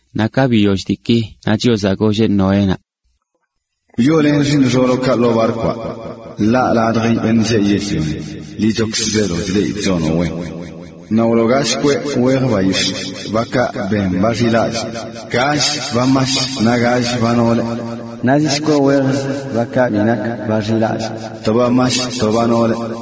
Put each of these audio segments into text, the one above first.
Naꞌ ka biyoll diiki ṉaa Chiozaꞌ golleꞌ Noénaꞌ: “Wyoolen xiiṉ xooloꞌkaꞌ ḻoo barkwaꞌ. Ḻaꞌ ladj yogꞌ beṉꞌ yell-lioni, liꞌchokzə zeelo chleꞌidꞌ chonoꞌ wen. Naꞌ wloo gall kweꞌ wejə bayix̱ꞌ, bakaꞌ benꞌ ba xilallꞌ, gall ba yag naꞌ gall ba noolə, naꞌ zi shkweꞌ wejzə bakaꞌ bi nak ba xilallꞌ, to ba yag to ba noolə.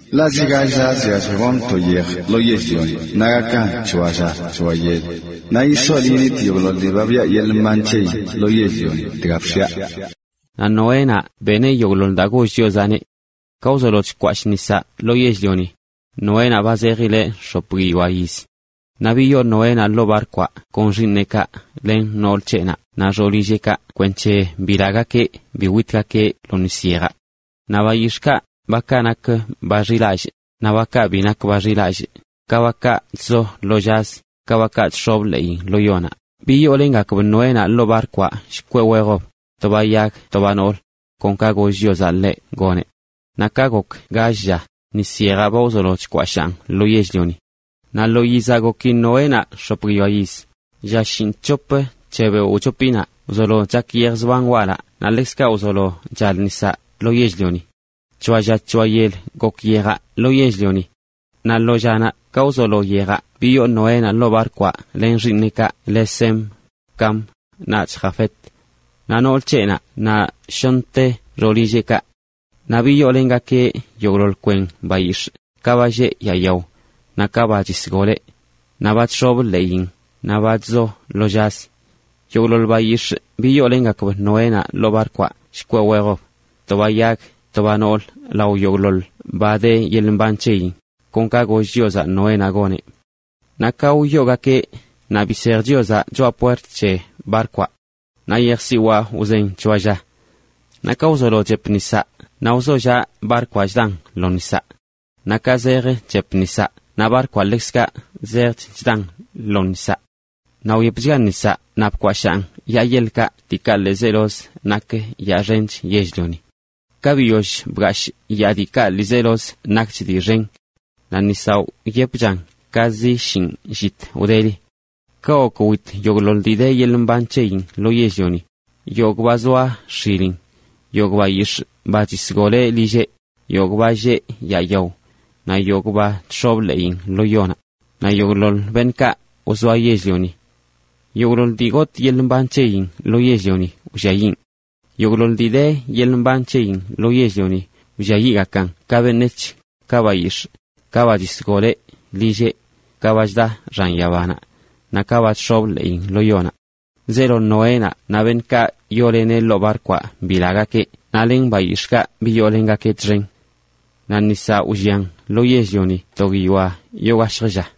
Ḻaꞌ zi gall llazə chyallj gonꞌ to yej lo yell-lioni naꞌ gakan c̱hoa lla c̱hoa yel, naꞌ yisol yiṉitꞌ yogꞌḻoḻ dii ba biꞌa yeḻꞌ mban c̱heyin lo yell-lioni dga bx̱iaꞌ.” Naꞌ Noénaꞌ beneꞌ yogꞌḻoḻ daa goll Chiozaꞌneꞌ. Ka wzolo chkwashꞌ nisaꞌ lo yell-lioni, Noénaꞌ ba zejileꞌ x̱op guiyoa yiz. Naꞌ biyoo Noénaꞌ ḻoo barkwaꞌ kon xiiṉeꞌkaꞌ len nool c̱heꞌnaꞌ naꞌ xoolilleꞌkaꞌ kwenc̱he bilagakeꞌ bi witgakeꞌ lo nis yejaꞌ. Naꞌ bayix̱ꞌkaꞌ, bakaꞌ nak ba xilallꞌ, naꞌ bakaꞌ bi nak ba xilallꞌ, ka bakaꞌ chzo lo llazə, ka bakaꞌ chx̱ob ḻeeyin lo yonaꞌ, biyoolengakb Noénaꞌ ḻoo barkwaꞌ shkweꞌ wejb, to ba yag to ba noolə, kon ka goll Chiozaꞌ ḻeꞌ goneꞌ. Naꞌ ka gok gall llakaꞌ, nis yejaꞌ wzolo chakan lo yell-lioni. Naꞌ lo yizaꞌ goki Noénaꞌ x̱op guiyoa yiz, lla shinꞌc̱hop c̱he beoꞌ wchopinaꞌ wzolo chak yej zban walaꞌ naꞌ ḻekzkaꞌ wzolo chal nisaꞌ lo yell-lioni. C̱hoa lla c̱hoa yel gok yejaꞌ lo yell-lioni. Naꞌ lo llanaꞌ ka wzolo yejaꞌ biyoo Noénaꞌ ḻoo barkwaꞌ len xiiṉeꞌkaꞌ le Sem, Cam naꞌch Jafet, naꞌ nool c̱heꞌnaꞌ naꞌ shoṉte xoolilleꞌkaꞌ. Naꞌ biyoolengakeꞌ yogꞌḻoḻ kwen bayix̱ꞌ, ka ba lleꞌ yaa yao, naꞌ ka ba chisgoleꞌ, naꞌ ba chx̱ob ḻeeyin, naꞌ ba chzo lo llazə. Yogꞌḻoḻ bayix̱ꞌkaꞌ biyoolengakb Noénaꞌ ḻoo barkwaꞌ shkweꞌ wejb, to ba yag to ba noolə lao yogꞌḻoḻ ba de yeḻꞌ mban c̱heyin, kon ka goll Chiozaꞌ Noénaꞌ goneꞌ. Naꞌ ka wyoogakeꞌ naꞌ bisej Chiozaꞌ choꞌa puert c̱he barkwaꞌ. Naꞌ yejsiwaa wzen c̱hoa lla. Naꞌ ka wzolo chep nisaꞌ naꞌ wzollaꞌ barkwaꞌ chdan lo nisaꞌ. Naꞌ ka zejch chep nisaꞌ naꞌ barkwaꞌ ḻekzkaꞌ zejch chdan lo nisaꞌ. Naꞌ wyepchga nisaꞌ naꞌ bkwashaan yaa yeḻkaꞌ diikaꞌ ḻiizelozə nak yaa xench yell-lioni. Ka biyoll bgashꞌ yaa diikaꞌ ḻiizelozə nakch dii xen, naꞌ nisaꞌ wyepchan ka zi shinꞌ llit wdeli. Kaꞌ gok wit yogꞌḻoḻ dii de yeḻꞌ mban c̱heyin lo yell-lioni, yogꞌ ba zoa x̱ilin, yogꞌ bayix̱ꞌ ba chisgoleꞌ lilleꞌ, yogꞌ ba lleꞌ yaa yao, naꞌ yogꞌ ba chx̱obə ḻeeyin lo yonaꞌ, naꞌ yogꞌḻoḻ beṉꞌkaꞌ wzoa yell-lioni. Yogꞌḻoḻ dii gotꞌ yeḻꞌ mban c̱heyin lo yell-lioni wlliayiꞌn. Yogꞌḻoḻ dii de yeḻꞌ mban c̱heyin lo yell-lioni wlliayiꞌgakan ka beṉec̱h, ka bayix̱ꞌ, ka ba chisgoleꞌ lilleꞌ, ka ba chda xan yabanaꞌ, naꞌ ka ba chx̱obə ḻeeyin lo yonaꞌ. Zeelo Noénaꞌ naꞌ beṉꞌkaꞌ yooleneꞌ ḻoo barkwaꞌ bilagakeꞌ naꞌ len bayix̱ꞌkaꞌ biyoolengakeꞌ txen. Naꞌ nisaꞌ wllian lo yell-lioni to guiyoa yoo gashjə lla.